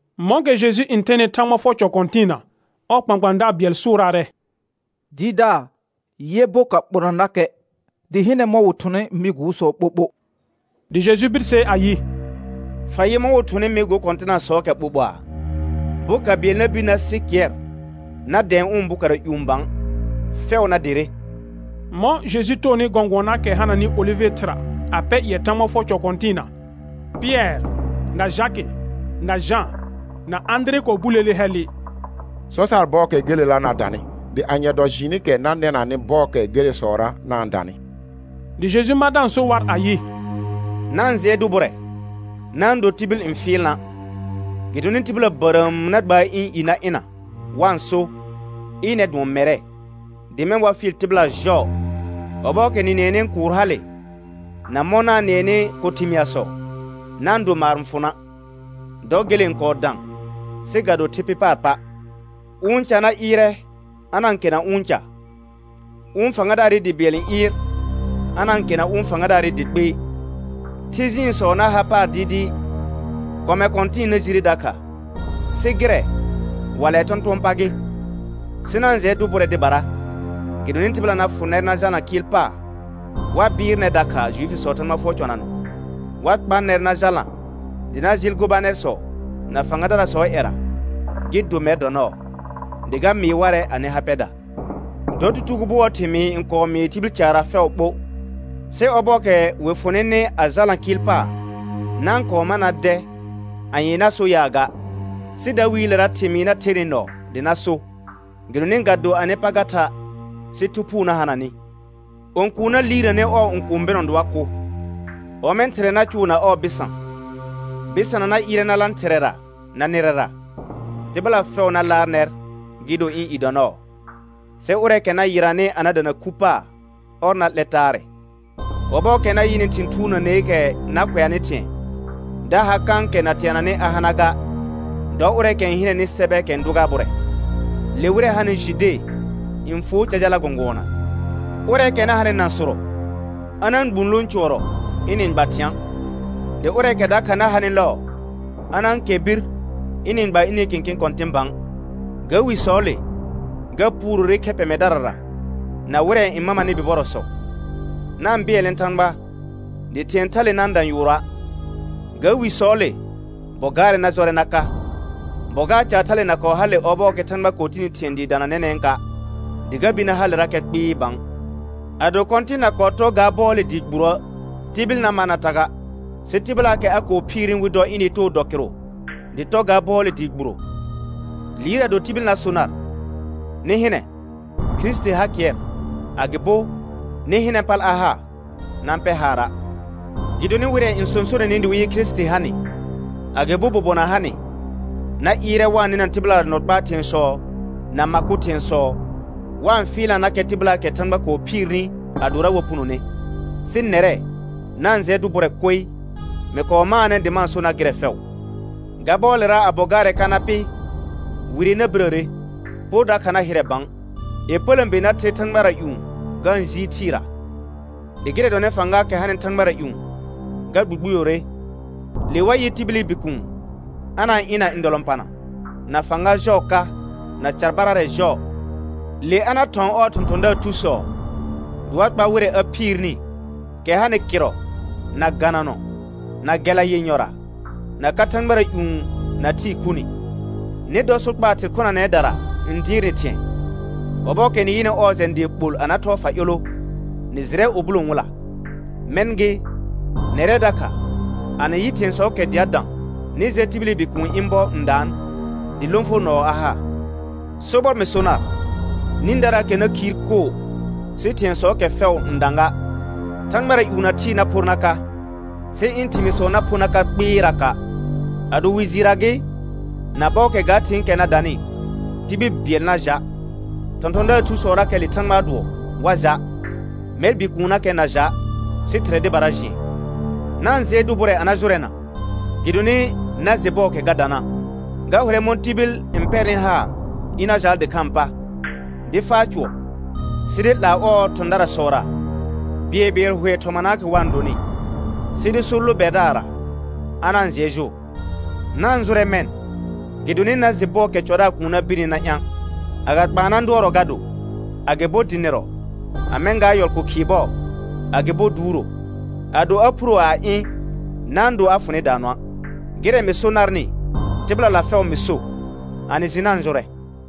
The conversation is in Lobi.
Mɔ̃kɛ Jeju n thenɩ Thãgba fʋɔr cɔ kɔ̃tɩɩna, ɔɔ kpãkpãadaar bɩɛl sʋʋraarɛ: Dɩɩrdaar, yɛ boka ɓɔnanakɛ, dɩ hɩnɛ mɔ̃ wɩ thʋnɩ mɩ gʋʋsɔ ɓoɓo. Dɩ Jeju birsee ayɩ: Fa yɩ mɔ̃ wɩ thʋnɩ mɩ go kɔ̃tɩnasɔɔkɛ ɓoɓoaa? Boka bɩɛl na bir na sɩ kɩɛr na dɛ̃ɛ ʋ̃ bokara ƴũ bã, fɛʋ na derre. Mɔ̃ Jeju toonɩ gɔ̃gʋɔnaakɛ hananɩ olɩvɩ thɩra a pɛ ƴɩɛ Thãgba fʋɔr cɔ kɔ̃tɩɩna, Pɩɛr na Jakɩ na Jã na Ãdire kɔɔ buleele hɛllɩ: Sɔ sar bɔɔkɛ gelela na danɩ, dɩ anye dɔ jɩɩnɩkɛ na nɛnanɩ bɔɔkɛ gelesɔra na-n danɩ. Dɩ Jeju ma da-n so war ayɩ: Na-n jɩɛ dʋ bʋrɛ, na-n do tibil n fɩɩl na'. Gɩdonɩ tɩbɩla bərəəm na gbaar ɩ̃ i na ɩna wa-n so, ɩnɛr dʋɔn mɛrɛ; dɩ mɛ̃ wa fɩɩl tɩbɩla jɔɔ. Ɔbɔɔkɛ nɩ nɩɛnɩ kʋʋr hale na mɔ̃ na-n nɩɛnɩ ko thɩmɩasɔ, na-n do maar n fʋ na', dɔ gele n kɔɔ dã sɩ ga do thɩ pɩ paar pa'. Ʋ ca na ɩɩrɛ a na-n kena ʋ̃ ca, ʋ̃ fãgadaarɩ dɩ bɩɛl n ɩɩr a na-n kena ʋ̃ fãgadaarɩ dɩ kpɩɩ. Thɩ jɩɩnsɔ na har paar dɩɩdɩɩ, kɔmɛ kɔ̃tɩ̃ɩ na jire dakha; sɩ gɩrɛ wallɛɛ tɔ̃tʋ̃ɔ pa gɩ. Sɩ na-n jɩɛ dʋ bʋrɛ dɩbara, gɩdonɩ tɩbɩla na fʋ nɛr na jalna kɩɩl paar; wa bɩɩr nɛr dakha Juifisɔɔ Thãgba fʋɔr cɔnanɔ; wa kpa nɛr na jalna dɩ na jɩɩl gobanɛrsɔ na fãgadarasɔɔ ƴɛra, gɩ do mɛr dɔ nɔɔ, dɩ ga mɩɩ warɛ anɩ ha pɛda. Dɔ tutugo bʋɔɔ thɩmɩɩ n kɔɔ mɩɩ tibil caarra fɛʋ ɓo. Sɩ ɔbɔɔkɛ wɩ fʋ nɩnɩ a jalna kɩɩl paar, na-n kɔɔ ma na dɛ anye na so yaa ga, sɩ dawiilera thɩmɩɩr na the ner nɔɔ dɩ na so, gɩdonɩ ga do anɩ pa ga tha', sɩ Thu Phʋʋ na hana nɩ. Õkuun na liirnanɛ ɔɔ õkũu bɩnɔ dɩ wa kʋ, ɔmɛ̃ thɩrɛ na cʋʋ na ɔɔ bɩsã; bɩsana na ɩɩrɛ na lã thɩrɛ na nɩrɛra. Tɩbɩla fɛʋ na laar nɛr gɩ do ɩ̃ i dɔ nɔɔ, sɩ ʋrɛɛkɛ na yɩranɩ a na dana khu paar, ɔr na 'lɛ taarɛ. Ɔbɔɔkɛ na yɩnɩ thɩ̃ thuurnəneekɛ na kʋɛanɩ thɩ̃ɛ da ha kãkɛ na teananɩ a hana ga (dɔ ʋrɛɛkɛ n hɩnɛnɩ sɛbɛɛkɛ n dʋ gar bʋrɛ), le wɩrɛ hanɩ Jude n fuo ca jala gɔ̃gʋɔna; ʋrɛɛkɛ na hanɩ nãsʋrɔ a na-n gbũ lõ cʋɔrɔ ɩnɩ-n gba thɩ̃a'; dɩ ʋrɛɛkɛ dakha na hanɩ lɔɔ a na-n kɛr bir ɩnɩ-n gba ɩnɩ kẽkẽ kɔ̃tɩ̃ bã. Ga wisɔɔle ga puurore khɛ pɛmɛdarara na wɩrɛ n mamanɩ bibɔrɔsɔ. Na-n bɩɛlnɛ Thãgba dɩ thɩ̃ɛ thale na-n dã yʋʋrɔa'. Ga wisɔɔle bɔ gaarɛ na jɔrɛ na ka, bɔ gaar caale na kɔɔ hale ɔbɔɔkɛ Thãgba kɔɔ tini thɩ̃ɛ dɩɩ dana nɛnɛ̃ka', dɩ ga bir na halerakɛ kpɩɩ bã. Ado Kɔ̃tɩn na kɔɔ tɔ ga bɔɔle dɩɩ gburoə', tibil na mar na ta ga, sɩ tɩbɩlaakɛ a kɔɔ phiirni wɩ dɔ ɩnɩ too dɔ kɩrʋ dɩ tɔ ga bɔɔle dɩɩ gburo. Liir ado tibil na so nar: Nɩ hɩnɛ Kirisiti har kɩɛr, agɩbo: Nɩ hɩnɛ pal a ha, na-n pɛr haara'. Gɩdonɩ wɩrɛ n sõsonenɩ dɩ wɩ yɩ Kirisiti ha nɩ, agɩbo bobona ha nɩ, na ɩɩrɛ wa-n nɩna tɩbɩla nɔ kpaa thɩ̃ɛsɔ na ma kʋ thɩ̃ɛsɔ, wa-n fɩɩlnanakɛ tɩbɩlaakɛ Thãgba kɔɔ phiirni adora wa punone. Sɩ nɛrɛ, na-n jɩɛ dʋ bʋrɛ koe; mɩ kɔɔ maanɛ dɩ ma-n so nar gɩrɛ fɛʋ. Ga bɔɔlera a bɔ gaarɛ ka na pɩ, wire na birəre, por dakha na hɩrɛ bã. Yepələ̃be na ther thãgbara ƴũ ga-n jiir thɩɩra, dɩ gɩrɛ dɔnɩ fãgaakɛ hanɩ thãgbara ƴũ ga gbugbuyore. Le wa yɩ tibili Bikuun a na-n ɩ̃ na ndɔlɔ̃pana na fãga jɔɔ ka na carbararɛ jɔɔ. Le a na thɔ̃ ɔɔ thɔ̃thɔ̃daar thusɔ dɩ wa kpa wɩrɛ a phiirni, kɛ hanɩ kɩrrɔ, na gananɔ, na gɛla yenyɔra, na ka thãgbara ƴũ na thɩɩ khuni. Nɩ dɔ sokpaa thɩr khonanɛdara n dɩɩrnɩ thɩ̃ɛ; ɔbɔɔkɛ nɩ yɩnɩ ɔɔ jɛ̃ dɩɩ ɓol a na thɔɔ fa ƴolo, nɩ jɩrɛ ubulo n wɩla. Mɛ̃ gɩ, nɛrɛ dakha a nɩ yɩ thɩ̃ɛsɔɔkɛ dɩ a dã, nɩ jɛ tibili Bikuuni ɩ̃ bɔ n daan, dɩ lõfonɔɔ a ha. Sobɔr mɩ so nar, nĩdaraakɛ na khiir koo sɩ thɩ̃ɛsɔɔkɛ fɛʋ n dã ga. Thãgbara ƴũ na thɩɩ na phor na ka, sɩ ɩ̃ thɩmɩɩsɔ na pho na ka kpɩɩraka'. Ado wi jɩɩrra gɩ, na bɔɔkɛ ga thɩ̃ɩkɛ na danɩ, tibil bɩɛl na ja', thɔ̃thɔ̃daar thusɔrakɛ le Thãgbaa dʋɔ wa ja', mɛr Bikuunnakɛ na ja', sɩ Thɩrɛ dɩbara jɩɛn. Na-n jɩɛ dʋ bʋrɛ a na jʋrɛna, gɩdonɩ na jɩ bɔɔkɛ ga dana'. Ga hʋrɛ mɔ̃ tibil n pɛrnɩ haar ɩna jaal dɩkhãa pa, dɩ faa cʋɔr sɩ dɩ 'laa ɔɔ thɔ̃daarsɔra bɩɛlbɩɛl hʋɛ thɔmanaakɛ wa-n donɩ, sɩ dɩ so lo bɛrdaarra, a na-n jɩɛ jʋʋr. Na-n jʋrɛ mɛ̃, gɩdonɩ na jɩ bɔɔkɛ cɔdaar kuun na birni na ɩ̃a'; agakpaana dʋɔrɔ ga do, agɩbo dɩnɩrɔ, a mɛ̃ gaa yɔl ko khɩɩ bɔɔ, agɩbo duuro. Ado a phuro a ɩ̃ na-n do a fʋ nɩ daanɔa'. Gɩrɛ mɩ so narnɩ, tɩbɩlala fɛʋ mɩ so: A nɩ jɩ na-n jʋrɛ.